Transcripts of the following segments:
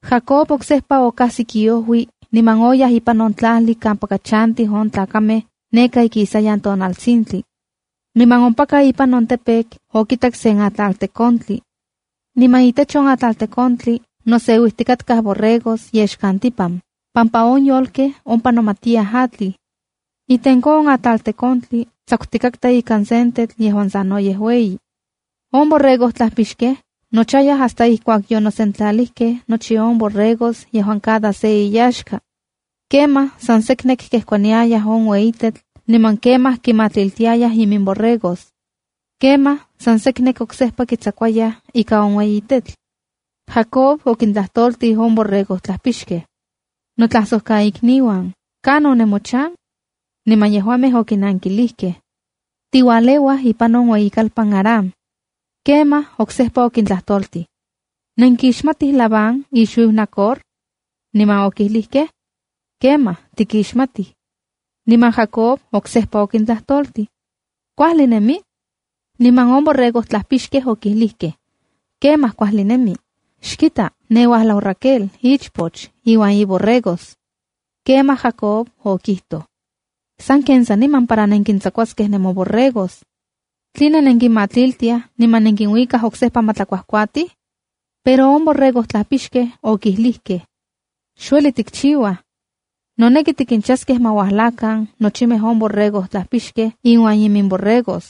Jacob oksejpa okajsik iojui niman oyaj ipan on tlajli kampaka chantij on tlakamej neka ikisayan tonaltsintli. Niman ompaka ipan on campo okitak sen atlaltekontli. Niman itech on atlaltekontli noseuijtikaktaj borregos yexkantipan, pampa on yolkej ompa nomatiyaj atlij. Itenko on atlaltekontli tsakutikatka ika sen tetl yejuan sanoyej ueyi. On borregojtlajpixkej nochayaj hasta ijkuak yonosentlalijkej nochi on borregos yejuan cada se inyaxka. Kemaj san seknek kejkuaniayaj on ueyi tetl niman kemaj kimatlitiayaj iminborregos. Kemaj san seknek oksejpa kitsakuayaj ika on ueyi tetl. Jacob okintlajtoltij on borregojtlajpixkej: —Notlajsojkaikniuan, ¿kanon nemochan? Niman yejuamej okinankilijkej: —Tiualeuaj ipan on ueyikalpan Harán. Kemaj oksejpa okintlajtoltij: —¿Nenkixmatij Labán ixuiu Nacor? Niman okilijkej: —Kemaj, tikiximatij. Niman Jacob oksejpa okintlajtoltij: —¿Kuajli nemi? Niman on borregojtlajpixkej okijlijkej: —Kemaj, kuajli nemi. Xkita, ne uajlau Raquel on ichpoch, iuan iborregos. Kemaj Jacob okijtoj: —Sanken saniman para nenkintsakuaskej nemoborregos. ¿Tline xnenkinmatliltiaj, niman nenkinuikaj oksejpa ma tlakuajkuatij? Pero on borregotlajpixkej okijlijkej: —Xueli tikchiuaj. Noneki tikinchaskej ma uajlakan nochimej on borregotlajpixkej inuan imimborregos.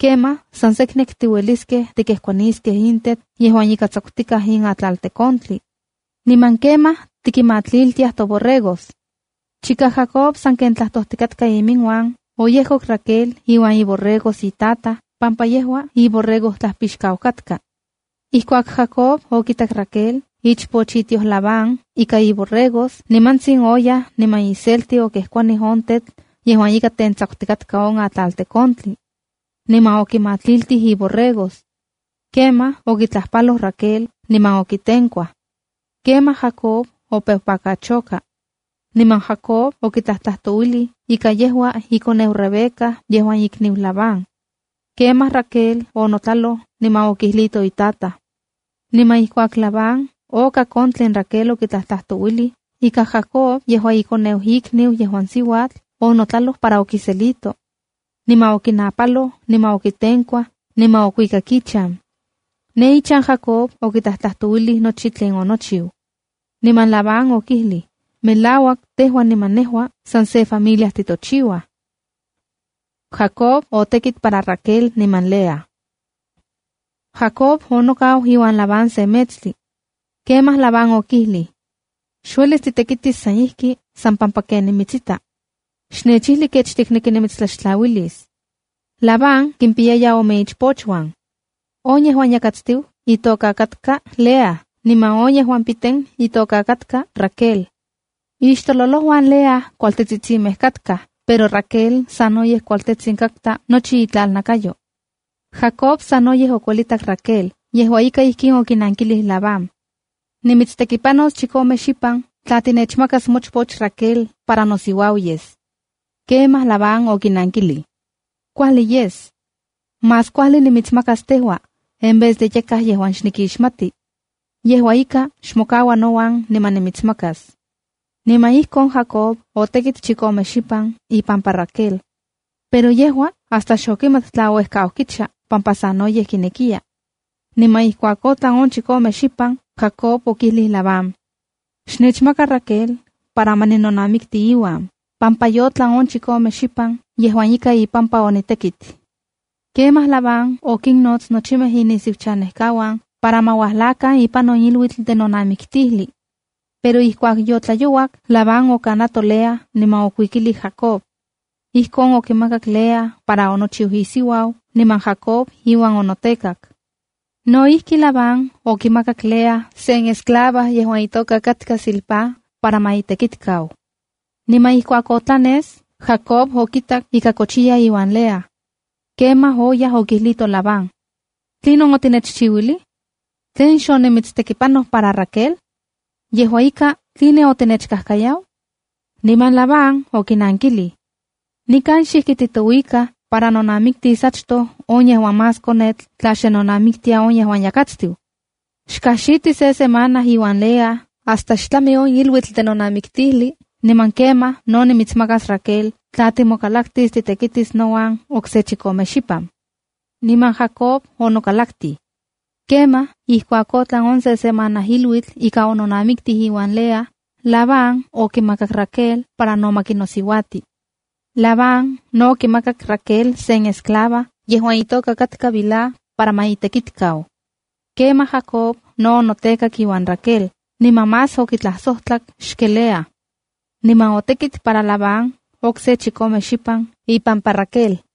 Kemaj san seknek tiueliskej tikejkuaniskej in tetl yejuan ika tsakutikaj in atlaltekontli. Niman kemaj tikinmatliltiaj toborregos. Chika Jacob sanken tlajtojtikatka inmiuan, oyejkok Raquel iuan iborregos itataj pampa yejua iborregojtlajpixkau katka. Ijkuak Jacob okitak Raquel, ichpoch itioj Labán, ika iborregos, nimantsin oyaj niman iselti okejkuanij on tetl yejuan ika tentsakutikatka on atlaltekontli. Niman okimatliltij iborregos. Kemaj okitlajpaloj Raquel niman okitenkuaj. Kemaj Jacob opeu pakachoka. Niman Jacob okitlajtlajtouilij ika yejua ikoneu Rebeca yejuan ikniu Labán. Kemaj Raquel onotlaloj niman okijlito itataj. Niman ijkuak Labán okak on tlen Raquel okitlajtlajtouilij, ika Jacob yejua ikoneu on ikniu yejuan siuatl, onotlaloj para okiselito. Niman okinajnapaloj, niman okitenkuaj, niman okuikak ichan. Ne ichan, Jacob okitlajtlajtouilij nochi tlen onochiu. Niman Labán okijlij: “Melauak tejua niman nejua san se familia titochiuaj.” Jacob otekit para Raquel niman Lea Jacob onokau iuan Labán se metstli. Kemaj Labán okijlij: —Xuelis titekitis san ijki san pampa ken nimitsita. Xnechijli kech tikneki nimitstlaxtlauilis. Labán kimpiyaya ome ichpochuan. On yejuan yakatstiu itoka katka Lea niman on yejuan piten itoka katka Raquel. Ixtololojuan Lea kualtetsitsimeja katka, pero Raquel sanoyej kualtetsin katka nochi itlanakayo. Jacob sanoyej okuelitak Raquel. Yejua ika, ijkin okinankilij: —Nimitstekipanos chikome xipan tla tinechmakas mochpoch Raquel para nosiuau yes. Kemaj Labán okinankilij: —Kuajli yes. Más kuajli nimitsmakas tejua, en vez de yakaj yejuan xnikixmati. Yejua ika, xmokaua nouan niman nimitsmakas. Niman ijkon Jacob otekit chikome xipan ipampa Raquel, pero yejua hasta xokimat tla ouejkau kicha pampa sanoyej kinekiya. Niman ijkuak otlan on chikome xipan, Jacob okijlij Labán: —Xnechmaka Raquel para ma ninonamikti iuan, pampa yotlan on chikome xipan yejuan ika ipampa onitekit. Kemaj Labán okinnots nochimej inisiuchanejkauan, para ma uajlakan ipan on iluitl de nonamiktijli. Pero ijkuak otlayouak, Labán okanato Lea, niman okuikilij Jacob. Ijkon okimakak Lea para onochiu isiuau, niman Jacob iuan onotekak. No ijki, Labán okimakak Lea sen esclava yejuan itoka katka Zilpá para ma itekitkau. Niman ijkuak otlanes, Jacob okitak ika kochiya iuan Lea. Kemaj oyaj, okijlito Labán: —¿Tlinon otinechchiuilij? ¿Tlen xonimitstekipanoj para Raquel? Yejua ika, ¿tline otinechkajkayau? Niman Labán okinankilij: —Nikan xijki titouikaj para nonamiktis achtoj on yejuan más konetl tla xe nonamiktia on yejuan yakatstiu. Xkajxiti se semana iuan Lea hasta ma tlami on iluitl de nonamiktijli, niman kemaj no nimitsmakas Raquel tla timokalaktis titekitis nouan okse chikome xipan. Niman Jacob onokalaktij. Kemaj ijkuak otlan on se semana iluitl ika ononamiki iuan Lea, Labán okimakak Raquel para no ma kinosiuauti. Labán no okimakak Raquel sen esclava yejuan itoka Bilha para ma itekitikau. Kemaj Jacob no onotekak iuan Raquel, niman más okitlajsojtlak xken Lea. Niman otekit para Labán okse chikome xipan ipampa Raquel.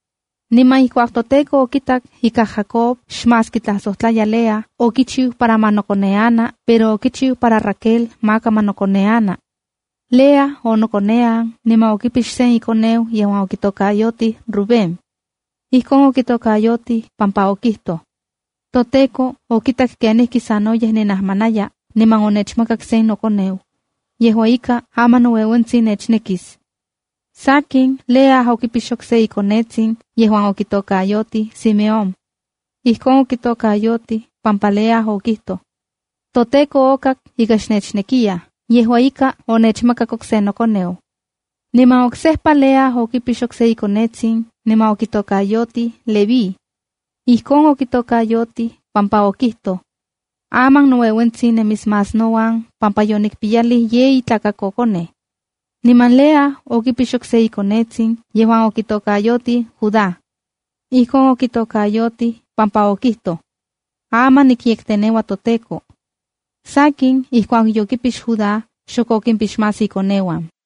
Niman ijkuak toTEKO okitak ika Jacob xmás kitlasojtlaya Lea, okichiu para ma nokoneana, pero okichiu para Raquel maka ma nokoneana. Lea onokonean niman okipix sen ikoneu yejuan okitokayotij Rubénb. Ijkon okitokayotij pampa okijtoj: “ToTEKO okitak kenijkisanoyej ninajmanaya, niman onechmakak sen nokoneu. Yejua ika, aman noueuentsin nechnekis.” Sakin, Lea okipix okse ikonetsin yejuan okitokayotij Simeónc. Ijkon okitokayotij pampa Lea okijtoj: “ToTEKO okak ika xnechnekiyaj. Yejua ika, onechmakak okse nokoneu.” Niman oksejpa Lea okipix okse ikonetsin niman okitokayotij Levíd. Ijkon okitokayotij pampa okijtoj: “Aman noueuentsin nemis más nouan pampa yonikpiyalij yeyi tlakakokonej.” Niman Lea okipix okse ikonetsin yejuan okitokayotij Judáe. Ijkon okitokayotij pampa okijtoj: “Aman nikyekteneua toTEKO.” Sakin, ijkuak yokipix Judá, xok okimpix más ikoneuan.